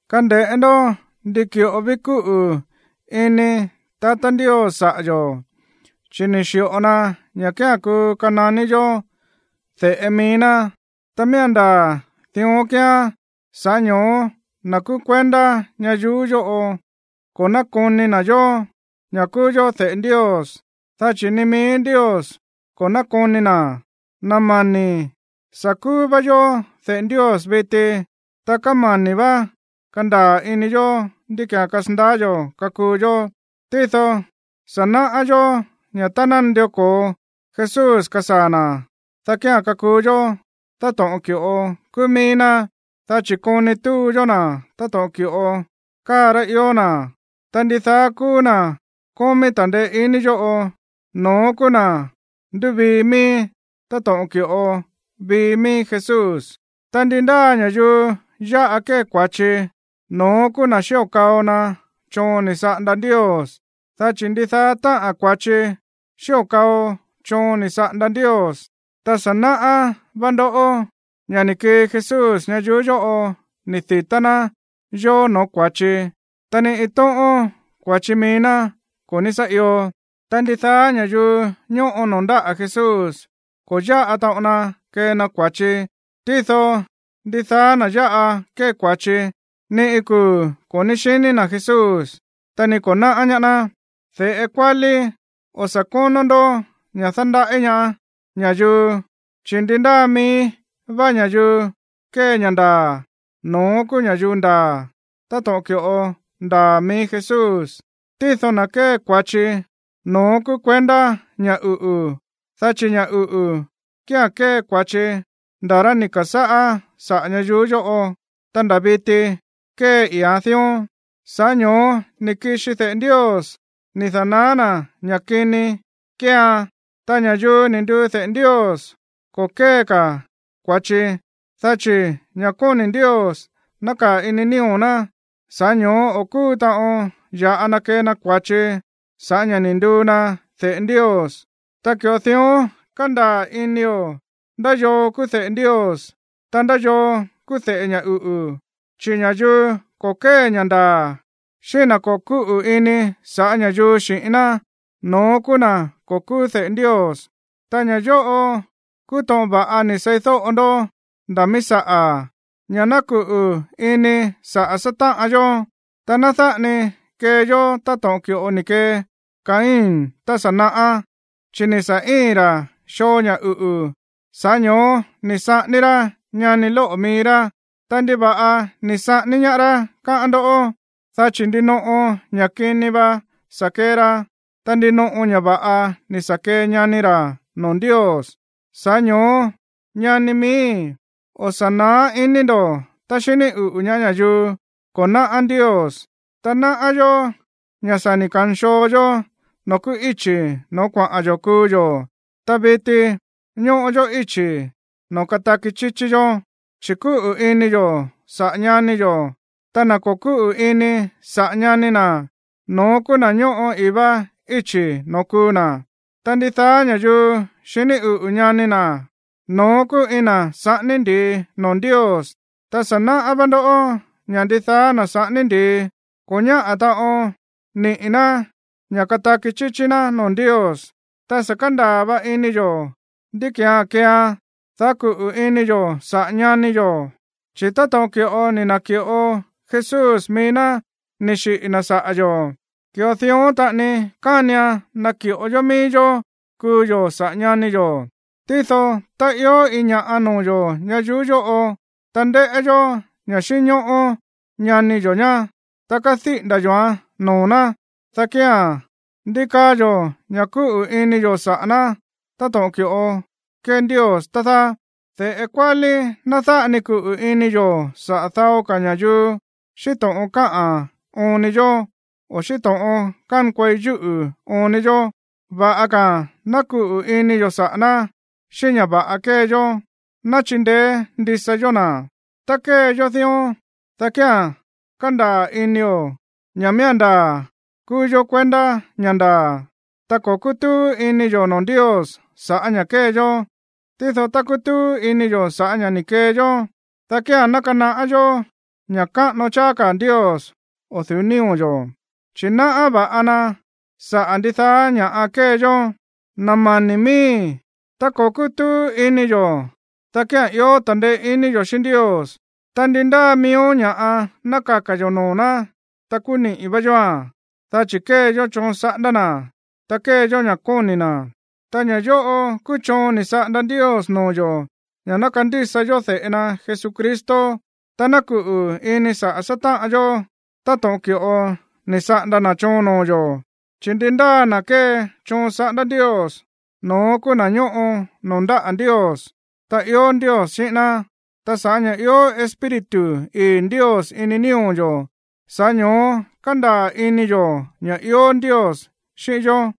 Kande̱ꞌé ndó ndi ki̱ꞌo ví kúꞌu̱ ini tatá Ndios saꞌa̱ yo̱, chi̱ ni̱ xi̱ꞌo na ña̱ kía̱n kuu kananí yó de̱ꞌe mií ná, ta miía̱n ndaa̱ dión kíán. Sa̱ꞌá ño̱ó na̱ kúú kuendá ñayuú yóꞌo ko̱ nákoni na̱ yó, ña̱ kúú yó de̱ꞌe Ndios, dá chi̱ ni mií Ndios ko̱ nákoni na̱. Na̱ mani̱í, sa̱ kúú vá yó de̱ꞌe Ndios viti, ta kámani̱ vá kandaa̱ ini yo̱ ndí ki̱án kasandaá yo̱ kakuu yó. Tído sa̱ náꞌá yó ña̱ tá ná nandió ko̱o Jesús kasaa̱ na̱, dá kía̱n kakuu yó táto̱ꞌon ki̱ꞌo kúú mií ná, dá chi̱ koni túu yó na̱ táto̱ꞌon ki̱ꞌo káa rá ió na̱. Ta ndidaá kúú na̱ kómí ta̱ndeé iní yóꞌo, no̱ón kúú na̱ ndúvii mií, táto̱ꞌon ki̱ꞌo vii mií Jesús. Ta ndi ndáa ña̱yuu yáꞌa kée kua̱chi, no̱ón kúú na̱ xío̱ kao na choon ni̱ saꞌanda Ndios. Dá chi̱ ndidaá táꞌa̱n kua̱chi xío̱ kao choon ni̱ saꞌanda Ndios. Ta sa̱ náꞌá va̱ꞌa ndó ña̱ ni̱ kii Jesús ñayuú yóꞌo ni̱ di̱tá ná yó noo̱ kua̱chi, ta ni iin tóꞌón kua̱chi mií ná ko̱ ní sá io. Ta ndidaá ña̱yuu ñóꞌo noo̱ ndáꞌa̱ Jesús ko̱ yáꞌa taꞌon na kée na kua̱chi. Tído ndidaá na̱ yáꞌa kée kua̱chi, ni iin kuu̱ ko̱ ní xini na̱ Jesús, ta ni ko̱ náꞌá ñaá ná. De̱ꞌe kuálí, o̱ sa̱ kónó ndó ña̱ dándaꞌí ñaá ña̱yuu, chi̱ ndi ndáa mií vá ña̱yuu kée ña̱ ndaa̱, no̱ón kúú ña̱yuu ndaa̱, táto̱ꞌon ki̱ꞌo ndaa̱ mií Jesús. Tído na̱ kée kua̱chi, no̱ón kúú kuendá ña̱ uꞌu̱, dá chi̱ ña̱ uꞌu̱ kía̱n kée kua̱chi ndá rá ni̱ ka̱sáꞌá saꞌa̱ ñayuú yóꞌo, ta nda̱ viti kée i̱íán dión. Sa̱ꞌá ño̱ó ni̱ kixi de̱ꞌe Ndios ni̱ da̱naá ná ña̱ kini kéean. Ta ña̱yuu ni̱ nduu de̱ꞌe Ndios ko̱ kée ka̱ kua̱chi, dá chi̱ ña̱ kóni̱ Ndios nákaa̱ ini nío̱ ná. Sa̱ꞌá ño̱ó o̱ kúu taꞌon ya̱ꞌa na kee na kua̱chi sa̱ꞌá ña̱ ni̱ nduu na de̱ꞌe Ndios. Ta ki̱ꞌo dión kándaa̱ inio̱ ndá yoo kúú de̱ꞌe Ndios, ta ndá yoo kúú de̱ꞌe ña̱ uꞌu̱. Chi̱ ña̱yuu ko̱ kée ña̱ ndaa̱, xíꞌín na̱ ko̱ kúꞌu̱ ini saꞌa̱ ña̱yuu xi̱ꞌín ná, no̱ón kúú na̱ ko̱ kúú de̱ꞌe Ndios. Ta ña̱ yóꞌo kúú to̱ꞌon va̱ꞌa ni̱ seídóꞌo ndó nda̱ mií saꞌa̱, ña̱ ná kuꞌu̱ ini saꞌa̱ sátáꞌan yó. Ta ná dáꞌa ni kee yó táto̱ꞌon ki̱ꞌo ni̱ kee Caín tá sa̱ naꞌá, chi̱ ni̱ sa̱ íi̱n ra̱ xoo ña̱ uꞌu̱. Sa̱ꞌá ño̱ó ni̱ saꞌání rá ñani lóꞌo̱ mií rá. Ta, ¿ndiva̱ꞌa ni̱ saꞌání ñaá rá, káꞌán ndoꞌó? Dá chi̱ ndinoꞌo ña̱ kini va sa̱ kee ra, ta ndinoꞌo ña̱ va̱ꞌa ni̱ sa̱ kee ñani ra̱ noo̱ Ndios. Sa̱ꞌá ño̱ó, ñani miíi̱, o̱ sa̱ náá iní ndo̱ tá xiní uꞌu̱ ñaá ña̱yuu ko̱ náꞌá Ndios. Ta náꞌá yó ña̱ sa̱ ni̱ kanxoo yó noo̱ kúú íchi̱ noo̱ kuaꞌa̱n yo̱ kuu yo̱, ta viti ñóꞌo yó íchi̱ noo̱ kataki chíchí yó, chi̱ kúꞌu̱ ini yo̱ saꞌa̱ ñani yo̱. Ta na̱ ko̱ kúꞌu̱ ini saꞌa̱ ñani na̱, no̱ón kúú na̱ ñóꞌo i̱í vá íchi̱ noo̱ kuu na̱. Ta ndidaá ña̱yuu xiní uꞌu̱ ñani na̱, no̱ón kúú iin na̱ saꞌání ndi̱i noo̱ Ndios. Ta sa̱ náꞌá vá ndó ña̱ ndidaá na̱ saꞌání ndi̱i ko̱ ñáꞌa̱ taꞌon niꞌi̱ ná ña̱ kataki chíchí ná noo̱ Ndios. Ta sa̱ kándaa̱ va̱ꞌa ini yo̱ ndí ki̱án keeá, dá kuꞌu̱ ini yo̱ saꞌa̱ ñani yo̱. Chi̱ táto̱ꞌon ki̱ꞌo ni̱ na̱ki̱ꞌo Jesús mií ná ni̱ xiꞌi̱ na̱ saꞌa̱ yo̱, ki̱ꞌo dión taꞌani kánian naki̱ꞌo yó mií yó kuu yo̱ saꞌa̱ ñani yo̱. Tído tá ió ña̱ꞌa noo̱ yo̱ ñayuú yóꞌo, ta ndéꞌé yó ña̱ xínñóꞌó ñani yo̱ ñá, ta kediꞌi̱nda̱ yo̱án noo̱ ná, dá kía̱n, ¿ndí kaá yo̱ ña̱ kúꞌu̱ ini yo̱ saꞌa̱ ná táto̱ꞌon ki̱ꞌo kée Ndios, tá dáá? De̱ꞌe kuálíí, ná dáꞌa ni kuꞌu̱ ini yo̱ saꞌa̱ dao ka̱ ña̱yuu xíꞌín to̱ꞌon káꞌa̱n oon ni yó, o̱ xíꞌín to̱ꞌon kánkuei yúꞌu̱ óon ni yó. Va̱ꞌa ka̱a̱n ná kuꞌu̱ ini yo̱ saꞌa̱ ná xíꞌín ña̱ va̱ꞌa kée yó, ta ná chindeé ndisa yó na̱. Tá kée yó dión, dá kía̱n kándaa̱ inio̱ ña̱ miía̱n ndaa̱ kúú yó kuendá ña̱ ndaa̱, ta ko̱ kútúú ini yo̱ noo̱ Ndios sa̱ꞌá ña̱ kée yó. Tído tá kutúú ini yo̱ sa̱ꞌá ña̱ ni̱ kee yó, dá kía̱n ná kanaꞌá yó ña̱ káꞌano cháá ka̱ Ndios o̱ du̱ú nío̱ yo̱, chi̱ náꞌá va̱ꞌa ná saꞌa̱ ndidaá kúú ña̱ꞌa kée yó. Na̱ mani̱ miíi̱, tá ko̱ kútúú ini yo̱, dá kía̱n ió ta̱ndeé iní yo̱ xíꞌín Ndios, ta ndi ndáa miíó ña̱ꞌa ná kaka̱ yo̱ noo̱ ná, ta kúú niꞌi̱ vá yóa̱n, dá chi̱ kée yó choon saꞌanda na̱, ta kée yó ña̱ kóni̱ na̱. Ta ña̱ yóꞌo kúú choon ni̱ saꞌanda Ndios noo̱ yo̱ ña̱ ná kandísa yó de̱ꞌe na Jesucristo, ta ná kuꞌu̱ ini saꞌa̱ sátáꞌan yó táto̱ꞌon ki̱ꞌo ni̱ saꞌanda na̱ choon noo̱ yo̱. Chi̱ ndi ndáa na̱ kée choon saꞌándá Ndios, no̱ón kúú na̱ ñóꞌo noo̱ ndáꞌa̱ Ndios, ta ió Ndios xíꞌín ná. Ta sa̱ꞌá ña̱ ió Espíritu ii̱ Ndios ini nío̱ yo̱, sa̱ꞌá ño̱ó kándaa̱ ini yo̱ ña̱ ió Ndios xíꞌín yó.